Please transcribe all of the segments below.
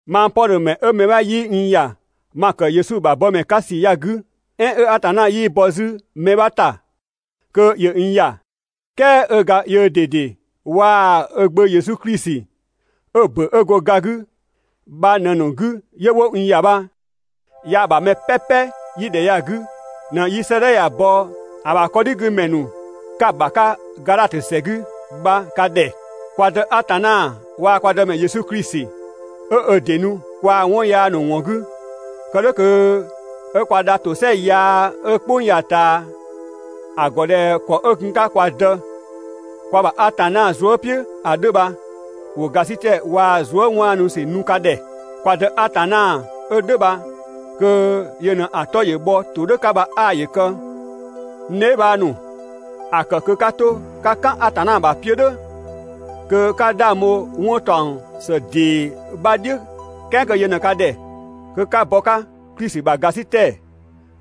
Mang Pɔdhö ‑mɛ 'ö mɛ 'bha 'yii n ‑ya ma ‑kë Yesu ‑bha bɔmɛ 'ka ‑sü ya‑ 'gü, "ɛɛn 'ö Atanna 'yii bɔ 'zü mɛ 'bha ‑ta kö ‑yö n ‑ya, "kɛɛ 'ö ga yöö ꞊dede waa‑ ö Gbö Yesu Klisi 'ö‑ ‑bö 'ö‑ bho ga 'gü bha ꞊në‑ ‑nu 'gü 'yö 'wo n ‑ya bha, yaa‑ ‑bha mɛ "pɛpɛ 'yi ‑dhɛ ya‑ 'gü ꞊në 'yi 'sëëdhɛ ya‑ bɔ ‑a ‑bha 'kɔdhigümɛ ‑nu 'ka‑ ‑bha 'ka Gadhatö ‑sɛ 'gü bha ka ‑dhɛ. Kwa Dë Atanna waa‑ kwa Dëmɛ Yesu Klisi 'ö ö ‑dɩ nu kwaa‑ 'wɔn yaa ‑nu ‑wɔn 'gü, kë "dhʋ̈ kö 'ö kwa dha ‑tosɛa yaa 'ö "kpʋng ya‑ ꞊taa ‑a ‑gɔ ꞊dhɛ ‑kɔ 'ö gun‑ 'ka kwa Dë, kwa ‑bha Atanna zuë" "piʋ̈ ‑a 'dhö bha, ‑wo ‑gasitɛ waa‑ zuë" 'waanu ‑sü nu ka ‑dhɛ. Kwa Dë Atanna 'ö "dhʋ̈ bha kö yö ꞊në‑ 'tɔ‑ bhɔ ‑todhʋ̈ 'ka bha 'aa ‑yö kë! (N dheebhang ‑nu,) ‑a ‑kë kö 'ka 'to 'ka "kan Atanna ‑bha 'piö‑ "dhʋ̈, kö 'ka 'dhang bho 'wɔn ‑taɔng ‑së ‑dee 'bha "dhiʋ̈ "kɛɛ kö yö ꞊në ka ‑dhɛ kö 'ka bɔ 'ö 'ka Klisi ‑bha ‑gasitɛ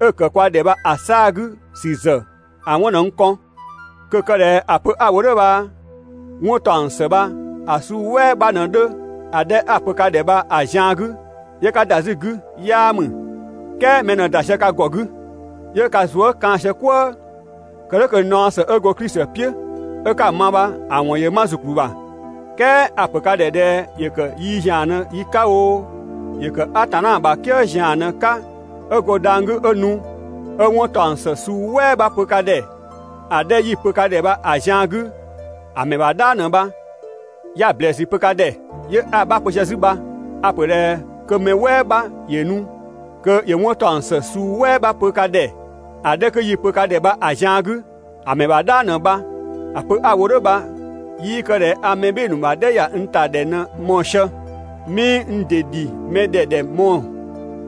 'ö‑ ‑kë kwa ‑dhɛ bha‑ 'saa‑ 'gü ‑sü ‑zë 'wɔn ꞊në n kɔn. Kö‑ kë ꞊dhɛ ‑a pö 'a‑ wo "dhʋ̈ bha 'wɔn ‑taɔng ‑së bha‑ suu "wɛɛ 'bha ꞊në 'dhö ‑a 'dhɛ 'a‑ pö ka ‑dhɛ bha‑ zian 'gü 'yö 'ka ‑da 'zü‑ 'gü 'yaa ‑mü. "Kɛɛ mɛ ꞊në ‑da sië ka ‑gɔ 'gü 'yö ka zuë" kaan‑ sië "kwëë. Kë "dhʋ̈ kö naɔ ‑së 'ö go Klisi "piʋ̈ 'ö 'ka‑ ma bha‑ ‑wɔn ‑yö 'ma ‑zukplü ‑bha. "Kɛɛ a‑ ‑pö ka ‑dhɛ ꞊dhɛ ‑yö ‑kë yi ‑zian ꞊në yi 'ka oo, ‑yö ‑kë Atanna ‑bha "kië ‑zian ꞊në‑ 'ka 'ö go dhang‑ 'gü 'ö nu, 'ö 'wɔn ‑taɔng ‑së suu "wɛɛ 'bha pö ka ‑dhɛ ‑a 'dhɛ 'yi‑ pö ka ‑dhɛ bha‑ zian 'gü, ‑a ‑mɛ ‑bha "dhang ꞊në bha! 'Ya‑ ‑blɛɛsü pö ka ‑dhɛ, 'yö 'a‑ 'bha pö sië 'zü bha. A‑ ‑pö ꞊dhɛ kö mɛ "wɛɛ 'bha ‑yö nu kö ‑yö 'wɔn ‑taɔng ‑së suu "wɛɛ 'bha pö ka ‑dhɛ ‑a 'dhɛ kö 'yi‑ pö ka ‑dhɛ bha‑ zian 'gü, ‑a ‑mɛ ‑bha "dhang ꞊në bha! ‑A pö 'a‑ wo "dhʋ̈ bha 'yii kë ꞊dhɛ a mɛ "bhɩɩ‑ ‑nu ‑bha "dhɛ ‑ya n ‑ta ‑dhɛ ꞊në‑ mɔɔ‑ sië. 'Mii n ‑dɩ ‑dhi mɛ ‑dhɛ ‑dhɛ mɔɔ‑.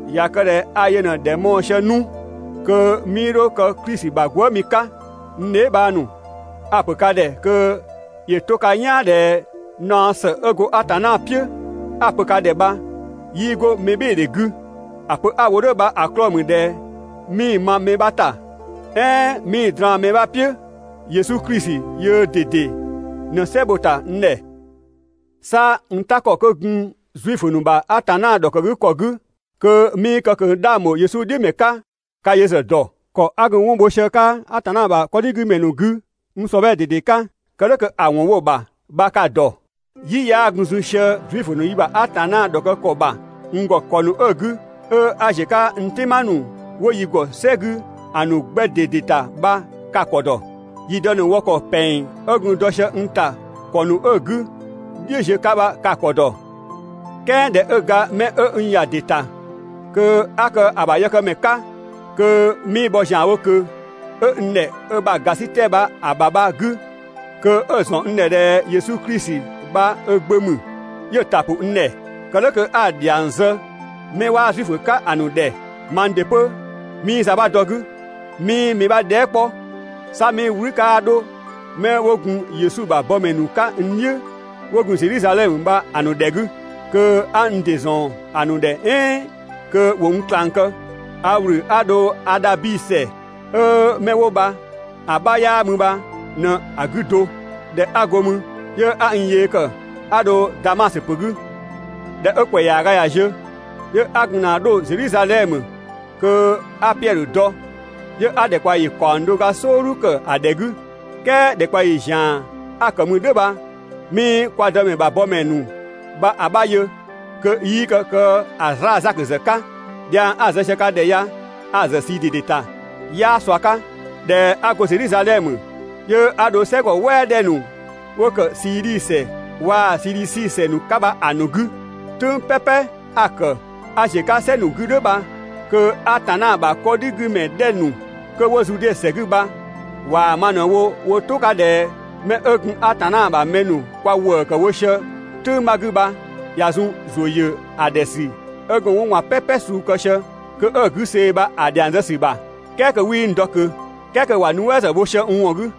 ꞊Ya kë ꞊dhɛ a yö ꞊në ‑dhɛ mɔɔ‑ sië 'nu, kö 'mii 'dho kë Klisi ‑bha gwëëmi 'ka. N dheebhang ‑nu, a‑ ‑pö ka ‑dhɛ kö ‑yö 'to ka "yaan ꞊dhɛ naɔ ‑së 'ö go Atanna "piʋ̈ 'a‑ pö ka ‑dhɛ bha 'yii 'go mɛbhɩɩdhe 'gü. ‑A pö 'a‑ wo "dhʋ̈ bha‑ 'klɔɔ‑ ‑mü ꞊dhɛ 'mii‑ ma mɛ 'bha ‑ta, "ɛɛn 'mii‑ draan‑ mɛ 'bha "piʋ̈, Yesu Klisi yöö ꞊dede ꞊në "sɛ bho‑ ‑ta n ‑dhɛ. 'Sa n "ta ‑kɔ 'kö gun Zuifö ‑nu ‑bha Atanna ‑dhɔkë ‑kɔ 'gü (kö 'mii kë ꞊kö 'dhang ‑bho Yesu "dhiʋ̈ ‑mɛ 'ka) ka yö ‑zë ‑dɔ. ‑Kɔ 'a gun 'wɔn bho sië‑ 'ka Atanna ‑bha 'kɔdhigümɛ ‑nu 'gü n ‑sɔbhɛɛ ꞊dede 'ka, kë "dhʋ̈ kö‑ ‑wɔn bho‑ ‑bha bha ka‑ ‑dɔ. "Yi 'yaa gun zun sië Zuifö ‑nu yi ‑bha Atanna ‑dhɔkë ‑kɔ ‑bha n ‑gɔ ‑kɔ ‑nu 'ö‑ 'gü, 'ö 'a ‑ziö 'ka n "tɩma ‑nu 'wo yi ‑gɔ "sɛ 'gü ‑a ‑nu 'gbɛ ꞊dede ‑ta bha ka‑ ‑kɔ ‑dɔ. Yi dë ‑nu wɔ ‑kɔ ‑pɛng 'ö gun dɔ sië n ‑ta ‑kɔ ‑nu 'ö‑ 'gü "dhiʋ̈ ziö 'ka bha ka‑ ‑kɔ ‑dɔ. "Kɛɛ ꞊dhɛ 'ö ga 'mɛ 'ö n ‑ya ‑dɩ ‑ta kö 'a kë ö ‑bha yëkëmɛ 'ka, kö 'mii bhɔ ‑zianwo ꞊kö, 'ö n ‑dhɛ ö ‑bha ‑gasitɛ bha‑ ‑bha bha‑ 'gü, kö 'ö‑ ‑zɔn n ‑dhɛ ꞊dhɛ Yesu Klisi bha ö Gbö ‑mü, 'yö‑ ‑ta ‑pʋ n ‑dhɛ, kë "dhʋ̈ kö 'a‑ ‑dhiang zë mɛ 'waa Zuifö 'ka‑ ‑nu ‑dhɛ, (mang ‑dɩ 'pö 'mii za 'bha dɔ‑ 'gü,) 'mii mɛ 'bha dhɛɛ" 'kpɔ. 'Sa 'mii "wlü 'kaa 'dho 'mɛ 'wo gun Yesu ‑bha bɔmɛ ‑nu 'ka n "dhiʋ̈ 'wo gun Zedhizadhɛmö bha‑ ‑nu ‑dhɛ 'gü, kö 'a n ‑dɩ ‑zɔn ‑nu ‑dhɛ "ɛɛn kö ‑wo n ꞊klang kë, a ‑wlü 'a dho Adhabi ‑sɛ ('ö 'mɛ 'wo bha‑ 'bha 'yaa mü bha) ꞊në‑ 'gü do. ꞊Dhɛ 'a go mü, 'yö 'a n yee ‑kë 'a dho Damasö ‑pö 'gü. ꞊Dhɛ 'ö ‑kwɛ ‑yaaga ꞊ya ziö, 'yö 'a gun ‑na 'dho Zedhizadhɛmö kö 'a Piɛdhö dɔ, 'yö 'a ‑dhɛkpaɔyi ‑kaɔng do ga "sɔɔdhu ‑kë ‑a ‑dhɛ 'gü. "Kɛɛ ‑dhɛkpaɔyi ‑zian 'a‑ ‑kë mü "dhʋ̈ bha 'mii kwa Dëmɛ ‑bha bɔmɛ ‑nu bha‑ 'bha yö, kö 'yii kë‑ 'zlaa‑ Zakö ‑zë 'ka. Dhiang 'a‑ zë sië ka ‑dhɛ ya, a‑ ‑zë ꞊sii ꞊dede ‑ta, 'yaa ꞊sua 'ka. ꞊Dhɛ 'a go Zedhizadhɛmö, 'yö 'a dho "sɛgɔ "wɛɛ 'dhɛ ‑nu 'wo ‑kë Siidhi ‑sɛ waa‑ Sidhisi ‑sɛ ‑nu 'ka bha‑ ‑nu 'gü. "Tʋ̈ng "pɛpɛ 'a‑ ‑kë 'a ‑ziö 'ka "sɛ ‑nu 'gü "dhʋ̈ bha, kö Atanna ‑bha 'kɔdhigümɛ 'dhɛ ‑nu 'kö 'wo Zude ‑sɛ 'gü bha ꞊waa‑ ma ꞊në wo wo "tʋ 'ka ꞊dhɛ 'mɛ 'ö gun Atanna ‑bha mɛ ‑nu kwa ‑wëë ‑kë wo sië "tʋ̈ng 'bha 'gü bha ꞊ya zun ‑zʋ ‑yö ‑a ‑dhɛ ‑sü 'ö gun 'wɔn ꞊gban "pɛpɛ suu kë sië kö 'ö‑ 'gü see‑ bha‑ ‑dhiang zë ‑sü ‑bha, "kɛɛ kö 'wii n dɔ ꞊kö. "Kɛɛ kö ‑wa nuɛ" ‑zë bho sië n ‑wɔn 'gü.